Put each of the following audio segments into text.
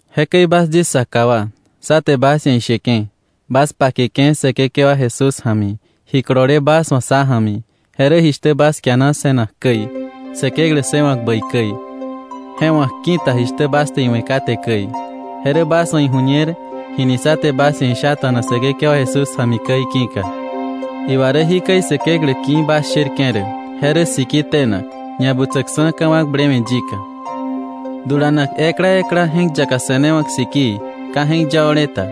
Jekäi bas yis saka wa, sá te bas ia̱ isheke̱, bas pakeke̱ Säkekewa Jesús ja̱mi, ji kolole bas wa̱ sá ja̱mi, je rä jishtä bas kiana se̱nak käi, Säkeklä ssëwa̱k bäi käi, je wa̱k ki̱ta jishtä bas te iwe̱ kate käi, je rä bas wa̱ iju̱ñer jini sá te bas ia̱ ishata̱na Säkekewa Jesús ja̱mi käi ki̱ka. Iwa rä jikäi Säkeklä ki̱ bas sherke̱ rä: je rä siki tenak, ñabutsäksa̱ ka̱wakblewe̱ yika, dulanak ekla ekla je̱k yaka se̱newa̱k sikii ka je̱k yao̱le ta,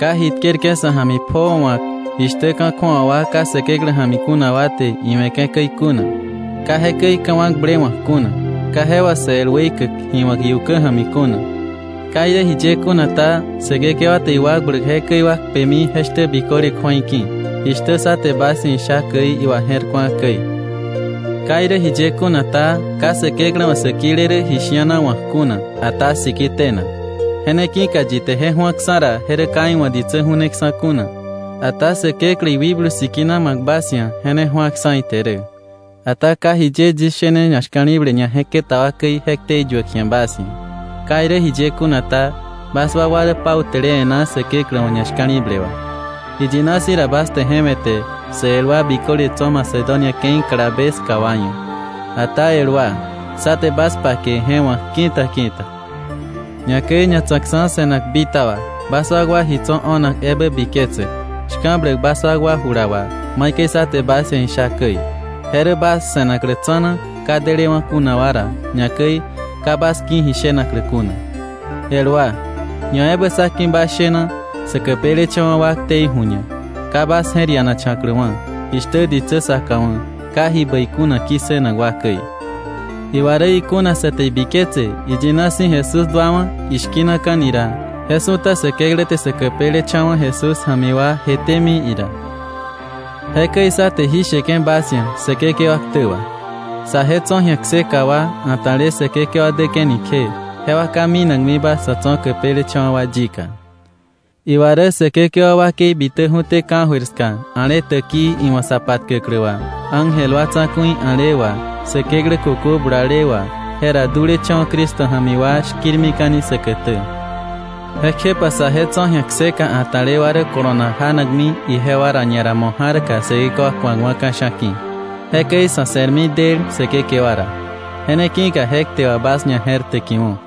ka ji tkerke̱ sa̱ ja̱mi pjoo wa̱k, jishtä ka̱ kju̱awa wa ka Säkeklä ja̱mi kuna wa te iwe̱ke̱ käi kuna, ka jekäi ka̱wakblewa̱k kuna, ka je wà sä el weikäk ji wa̱k iukä ja̱mi kuna. Ka irä jiye kuna ta, Säkekewa te iwakbläk jekäi wa kpemi je shtä biköle kju̱ei ki̱, jishtä sá te bas ia̱ isha käi iwaje̱rku̱a käi. Ka irä jiye kuna ta, ka Säkeklä wa̱ sä kile rä ji shi̱ana wa̱k kuna, ata sikii tenak. Je ne ki̱ka yi te je ju̱aksa̱ ra, je rä ka iwa̱ ditsä ju̱neksa̱ kuna, ata Säkeklä, iwikblu Sikina ma̱k bas ia̱, je ne ju̱aksa̱ ite rä. Ata ka jiye yis shene ñashka̱li̱ble ñaje̱keta wa käi je ktei yuäk ji̱a bas ia̱. Ka irä jiye kuna ta, bas wakwa rä pautäle e̱ná Säkeklä wa̱ ñashka̱li̱ble wà. Iyina si̱ ra bas te je we̱te sä el wa biköle tso̱ Macedonia ke̱i kalabe ska wa ia̱. Ata el wa, sá te bas pake je wa̱k ki̱ta ki̱ta, ñakäi ñatsa̱kksa̱ se̱nak bitaba, bas wakwa ji tso̱ o̱nak ebä biketsäk, shka̱bläk bas wakwa jula wà maikäi sá te bas ia̱ isha käi, je rä bas se̱naklä tsa̱na ka delewa̱ kuna wa ra, ñakäi ka bas ki̱ ji shenaklä kuna. El wa, ñaebä sá ki̱ bas shena sä käpelecha̱wa̱ wa ktei ju̱ñak, ka bas je̱r ianacha̱kläwa̱, jishtä ditsä saka wa̱ ka ji bäi kuna ki̱ssënak wa käi. Iwa rä ikuna sa te ibiketse iyina si̱ Jesús duawa̱ ishki̱naka̱ni ra, je su̱ta Säkeklä te sä käpelecha̱wa̱ Jesús ja̱mi wa jetémi ira. Jekäi sá te jí sheke̱ bas ia̱ Säkekewa ktä wà, saje tso̱ ji̱a kseka wa, a̱ta̱le Säkekewa däke̱ni kje, jewa ka minakmiba sä tso̱ käpelecha̱wa̱ wa yika. Iwa rä Säkekewa wakei bitäju̱té ka̱jöir ska a̱le täkii iwa̱ sa patkäklä wà, ángel wa tsa̱ku̱i a̱le wà, Säkeklä kökö bulale wà, jera dulecha̱wa̱ Cristo ja̱mi wa shki̱rmika̱ni säkätä. Jekjepa saje tso̱ ji̱a kseka a̱ta̱le wa rä kolonak janakmi ijewa ra ñara mo̱ ja̱rka Säkekewa ku̱akwa̱ ka̱sha̱ ki̱. Jekäi sa̱ se̱rmi del Säkekewa ra. Je ne ki̱ka je kte wà bas ñaje̱rtäkiwo̱.